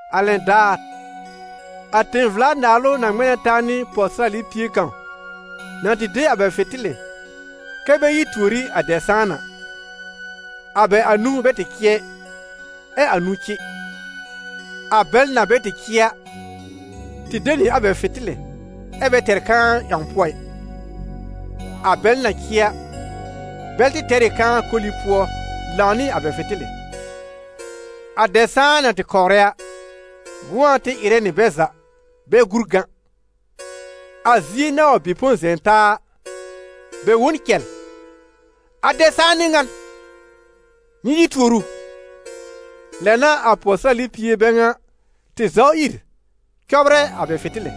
«A lɛn daar, a tẽ-vla-naalʋ na ŋmɛ̃ na taa nɩ pɔwsɩrali pie kãw na tɩ de a bɛ fɩ̃tɩlɩ kɛ́ bɛ yi tuor ɩ a dɛb-sãan a. A bɛ anũu bɛ tɩ cɩ ɛ, ɛ anũu cɩ. A bɛl na bɛ tɩ cɩ a, tɩ de nɩ a bɛ fɩ̃tɩlɩ ɛ bɛ tɛr kãa ƴãw pʋɔ ɩ. A bɛl na cɩ a, bɛl tɩ tɛr ɩ kãa koli pʋɔ lãw nɩ a bɛ fɩ̃tɩlɩ. A dɛb-sãan na tɩ kɔwrɛ a, gʋ̃ɔ tɩ ɩrɛ nɩ bɛ za, bɛ gúr gã. A zie na wa bɩ põ zɛ̃ taa a, bɛ wõ n cɛl: ‹A dɛb-sãan n'ɩ ŋan! Nyɩ yi tuor ʋ!› Lɛ n'a a pɔwsɩrali pie bɛ ŋa tɩ zaw ìr cɔbrɛ a bɛ fɩ̃tɩlɩ.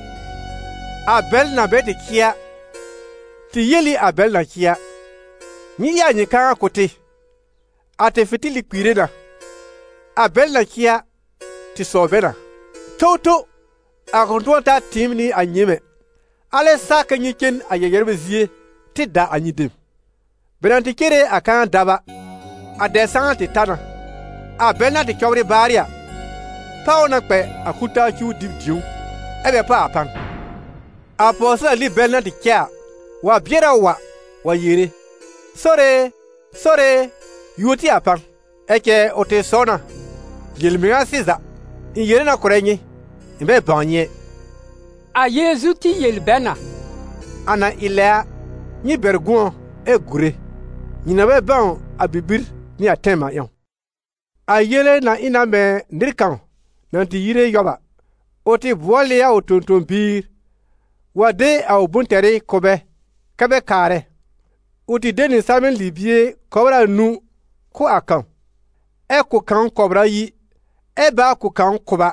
A bɛl na bɛ cɩ a, tɩ yel ɩ a bɛl na cɩ a: ‹Nyɩ ɩ a nyɩ kãa kʋ̀ tɩ, a tɩ fɩ̃tɩlɩ kpiire na.› A bɛl na cɩ a, tɩ sɔw bɛ na: ‹Towtow! A kʋ̃ tʋ̃ɔ ta tɩɩm nɩ a nyɩɩm ɛ. Alɛ sa kɛ nyɩ cen a yɛ-yɛrbɛ zie tɩ da a nyɩ dem.› Bɛ na tɩ cere a kãa dab a, a dɛb-sãn tɩ ta na. A bɛl na tɩ cɔbrɩ baarɩ a, páw ʋ na kpɛ a kul-taa cuw dɩb dĩ̀ó, ɛ́ bɛ kpa a pan. A pɔwsɩrali bɛl na cɛ a, wa bɩɛr a wa, wa yere: ‹Sore e, Sore e, yuo tɩ a pan!› Ɛ cɛ ʋ tɩ sɔw na: ‹Yel-mɩŋa sɩza, ɩ̃ yere na kʋ̀rɛ nyɩ, ɩ̃ bɛ bãw nyɩ ɛ.›» A Yeezu tɩ yel bɛ na: «A na ɩ lɛ a, nyɩ bɛr gʋ̃ɔ ɛ gùre, nyɩ na bɛ bãw a bibir nɩ a tɛm a ƴãw.» «A yele na ɩ na mɛ̃ nɩr kãw na tɩ yire yɔb a: ʋ tɩ bʋɔl ɩ a ʋ tõ-tõ-biir wa de a ʋ bʋ̃-tɛrɩ kʋ̀ bɛ kɛ bɛ kaarɛ. Ʋ tɩ de nɩ salmɛ̃ libie kɔbr anũu kʋ̀ a kãw. Ɛ kʋ̀ kãw kɔbr ayi, ɛ báa kʋ̀ kãw kʋba,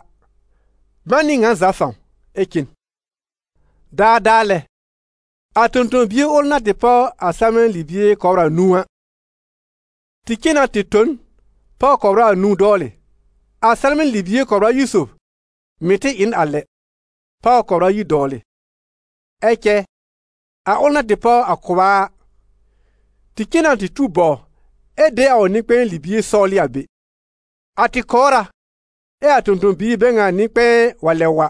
man nɩ ŋa za fãw, ɛ cen. Daadaa lɛ, a tõ-tõ-bie ʋl na tɩ páw a salmɛ̃ libie kɔbr anũu a, tɩ cen na tɩ tõ n, páw kɔbr anũu dɔwlɩ. A salmɛ̃ libie kɔbr ayi sob mɩ̀ tɩ ɩ n a lɛ, páw kɔbr ayi dɔwlɩ. Ɛ cɛ a ʋl na tɩ páw a kʋba a, tɩ cen na tɩ tuw bɔw ɛ de a ʋ nɩ-kpɛ̃ɛ libie sɔwlɩ a be. A tɩ kɔwrɩ na, ɛ a tõ-tõ-biir bɛ ŋa nɩ-kpɛ̃ɛ wa lɛb wa,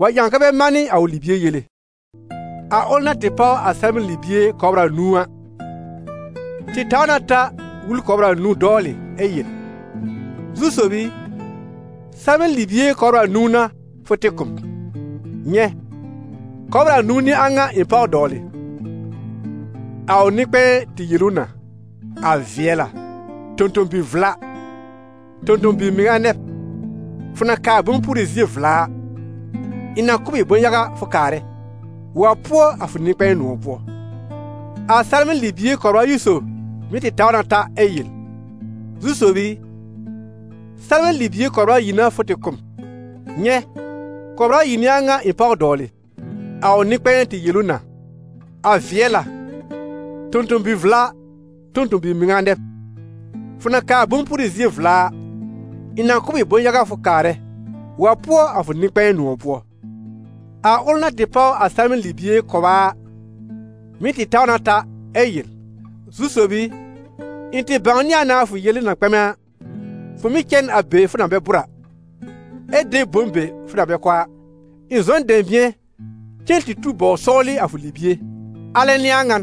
wa ƴãw kɛ bɛ manɩ a ʋ libie yele. A ʋl na tɩ páw a salmɛ̃ libie kɔbr anũu a, tɩ taw na ta wul kɔbr anũu dɔwlɩ ɛ yel: ‹Zu-sob i, salmɛ̃ libie kɔbr anũu n'a fʋ tɩ kʋ̀ m, nyɛ̃, kɔbr anũu n'ɩ a ŋa ɩ̃ páw dɔwlɩ.› A ʋ nɩ-kpɛ̃ɛ tɩ yel ʋ na: ‹A vɩɛl a, tõ-tõ-bi-vla, tõ-tõ-bi-mɩŋa nɛ b; fʋ na kaa bʋ̃-pʋrɩ zie vla a, ɩ̃ na kʋ̀ b ɩ bʋ̃-yaga fʋ kaarɛ. Wa pʋɔ a fʋ nɩ-kpɛ̃ɛ nʋ̃ɔ̀ pʋɔ.› A salmɛ̃ libie kɔbr ayi sob mɩ̀ tɩ taw na ta ɛ yel: ‹Zu-sob i, salmɛ̃ libie kɔbr ayi n'a fʋ tɩ kʋ̀ m, nyɛ̃, kɔbr ayi n'ɩ a ŋa ɩ̃ páw dɔwlɩ.› A ʋ nɩ-kpɛ̃ɛ tɩ yel ʋ na: ‹A vɩɛl a, tõ-tõ-bi-vla, tõ-tõ-bi-mɩŋa nɛ b! Fʋ na kaa bʋ̃-pʋrɩ zie vla a, ɩ̃ na kʋ̀ b ɩ bʋ̃-yaga fʋ kaarɛ. Wa pʋɔ a fʋ nɩ-kpɛ̃ɛ nʋ̃ɔ̀ pʋɔ.› A ʋl na tɩ páw a salmɛ̃ libie kʋba a, mɩ̀ tɩ taw na ta ɛ yel: ‹Zu-sob i, ɩ̃ tɩ bãwnɩ a na a fʋ yele na kpɛmɛ a: fʋ mɩ́ cɛ n a be fʋ na bɛ bʋ̀r a, ɛ de bom be fʋ na bɛ kɔ a. Ɩ̃ zɔ n dɛ̃bɩ̃ɛ cen tɩ tuw bɔw sɔwlɩ a fʋ libie: alɛ n'ɩ ŋan,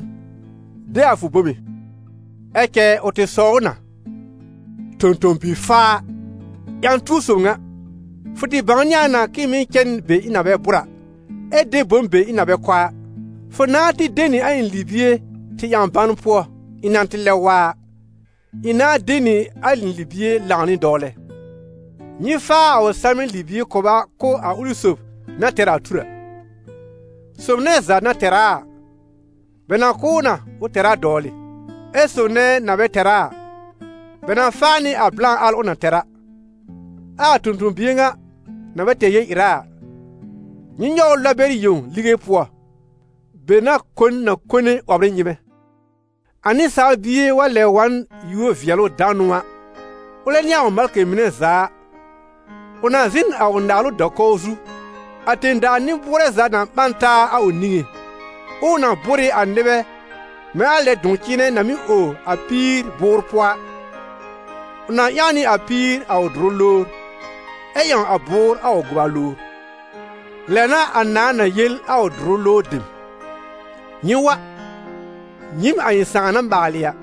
de a fʋ bome.› Ɛ cɛ ʋ tɩ sɔw ʋ na: ‹Tõ-tõ-bi-faa, ƴã-tuo sob ŋa! Fʋ tɩ bãwnɩ a na k'ɩ̃ɩ mɩ́ cɛ n be ɩ̃ na bɛ bʋ̀r a, ɛ de bom bɛ ɩ̃ na bɛ kɔ a, fʋ nãá tɩ de nɩ a ɩ̃ libie tɩ ƴãw ban pʋɔ; ɩ̃ na tɩ lɛb wa a, ɩ̃ nãá de nɩ a ɩ̃ libie lãw nɩ dɔwlɛ.› Nyɩ faa a ʋ salmɛ̃ libie kʋba kʋ̀ a ʋlɩ sob na tɛr a tur a. Sob nɛ za na tɛr a a, bɛ na kʋ̀ ʋ na, ʋ tɛr a dɔwlɩ; ɛ sob nɛ na bɛ tɛr a a, bɛ na fa nɩ a blã al ʋ na tɛr a. Ɛ a tõ-tõ-bie ŋa na bɛ tɛr yel-ɩra a, nyɩ nyɔw ʋ lɔb bɛr yẽw lige pʋɔ, be n'a kon na kone 'wɔbr ɩ nyɩ́mɛ́.» «A Nɩsaal Bie wa lɛb wa n yúor-vɩɛlʋ-danʋ a, ʋlɛ nɩ a ʋ malkɩ mɩnɛ za a, ʋ na zɩ̃ n a ʋ naalʋ da-kɔw zu. A tẽ-daa nɩ-bʋʋrɛ za na ɓã n taa a ʋ niŋé, ɛ ʋ na bʋ́r ɩ a nɩbɛ mɛ̃ a lɛ a dʋ̃-cɩ̃ɩnɛ na mɩ́ ow a píir bʋʋr pʋɔ a. Ʋ na ƴãw nɩ a píir a ʋ dʋrʋ lowr, ɛ ƴãw a bʋʋr a ʋ gʋba lowr. Lɛ n'a a nãà na yel a ʋ dʋrʋ lowr dem: ‹Nyɩ wa, nyɩɩm a ɩ̃ Sãà na maalɩ a,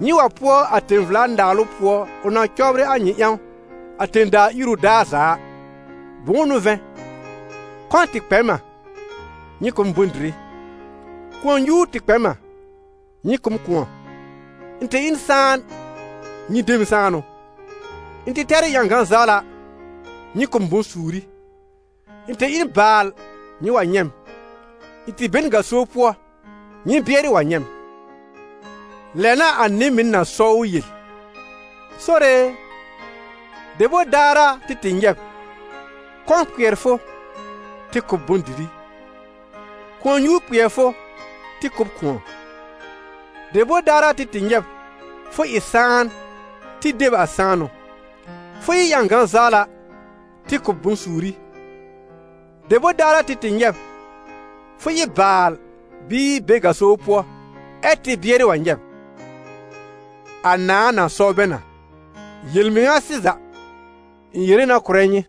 nyɩ wa pʋɔ a tẽ-vla-naalʋ pʋɔ ʋ na cɔbrɩ a nyɩ ƴãw a tẽ-daa iru daar za a. Bʋ̃ʋ n'ʋ vɛ̃, kɔ̃ tɩ kpɛ m a, nyɩ kʋ̀ m bʋ̃-dɩrɩ; kʋ̃ɔ-nyuur tɩ kpɛ m a, nyɩ kʋ̀ m kʋ̃ɔ; ɩ̃ tɩ ɩ n sãan, nyɩ de m sãanʋ; ɩ̃ tɩ tɛr ɩ ƴãgã-zawla, nyɩ kʋ̀ m bʋ̃-suuri; ɩ̃ tɩ ɩ n baal nyɩ wa nyɛ̃ m; ɩ̃ tɩ be n gaso pʋɔ, nyɩ bɩɛrɩ wa nyɛ̃ m.› Lɛ n'a a nɩ-mɩn na sɔw ʋ yel: ‹Sore e, debor daar a, tɩ tɩ nyɛ̃ b, kɔ̃ kpɩɛr fʋ, tɩ kʋ̀ b bʋ̃-dɩrɩ, kʋ̃ɔ-nyuur kpɩɛr fʋ, tɩ kʋ̀ b kʋ̃ɔ? Debor daar a, tɩ tɩ nyɛ̃ b, fʋ ɩ sãan, tɩ de b a sãanʋ, fʋ ɩ ƴãgã-zawla, tɩ kʋ̀ b bʋ̃-suuri? Debor daar a, tɩ tɩ nyɛ̃ b, fʋ ɩ baal bɩɩ be gaso pʋɔ, ɛ tɩ bɩɛrɩ wa nyɛ̃ b?› A nãà na sɔw bɛ na: ‹Yel-mɩŋa sɩza, ɩ̃ yere na kʋ̀rɛ nyɩ,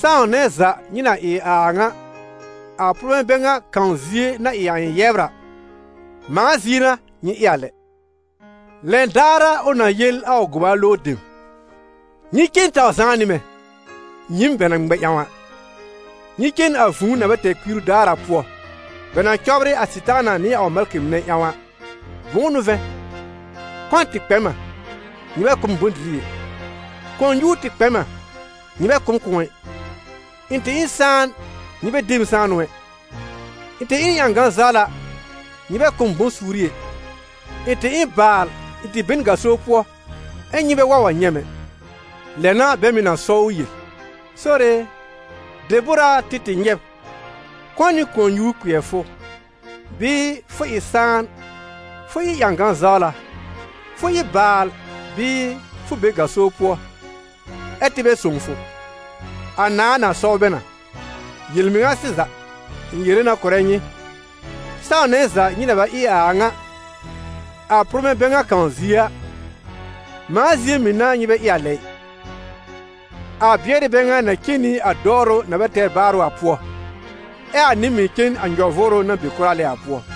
sãw nɛ za nyɩ na ɩ a a ŋa a pʋrmɛ̃ bɛ ŋa kãw zie na ɩ a ɩ̃ yɛbr a, mãa zie n'a nyɩ ɩ a lɛ.› Lɛn daar a, ʋ na yel a ʋ gʋba lowr dem: ‹Nyɩ cen taw zãá nɩ mɛ̃, nyɩɩm bɛ na ŋmɛ ƴãw a, nyɩ cen a vũu na bɛ tɛr kpiiru daar a pʋɔ, bɛ na cɔbrɩ a Sɩtaana nɩ a ʋ malkɩ mɩnɛ ƴãw a. Bʋ̃ʋ n'ʋ vɛ̃, kɔ̃ tɩ kpɛ m a, nyɩ bɛ kʋ̀ m bʋ̃-dɩrɩ ɛ; kʋ̃ɔ-nyuur tɩ kpɛ m a, nyɩ bɛ kʋ̀ m kʋ̃ɔ ɩ; ɩ̃ tɩ ɩ n sãan nyɩ bɛ de m a sãanʋ ɛ; ɩ̃ tɩ ɩ n ƴãgã-zawla, nyɩ bɛ kʋ̀ m bʋ̃-suuri ɛ; ɩ̃ tɩ ɩ n baal, ɩ̃ tɩ be n gaso pʋɔ, ɛ nyɩ bɛ wa wa nyɛ̃ m ɛ.› Lɛ n'a bɛ mɩ̀ na sɔw ʋ yel: ‹Sore e, debor a tɩ tɩ nyɛ̃ b, kɔ̃ nɩ kʋ̃ɔ-nyuur kpɩɛr fʋ, bɩɩ fʋ ɩ sãan, fʋ ɩ ƴãgã-zawla, fʋ ɩ baal bɩɩ fʋ be gaso pʋɔ, ɛ tɩ bɛ sõw fʋ?› A nãà na sɔw bɛ na: ‹Yel-mɩŋa sɩza, ɩ̃ yere na kʋ̀rɛ nyɩ, sãw nɛ za nyɩ na bɛ ɩ a a ŋa a pʋrmɛ̃ bɛ ŋa kãw zie a, mãa zie mɩ̀ n'a nyɩ bɛ ɩ a lɛ ɩ.› A bɩɛrɩ bɛ ŋa na cen nɩ a dɔwrʋ na bɛ tɛr baarʋ a pʋɔ, ɛ a nɩ-mɩn cen a nyɔ-vʋʋrʋ na be kʋra lɛ a pʋɔ.»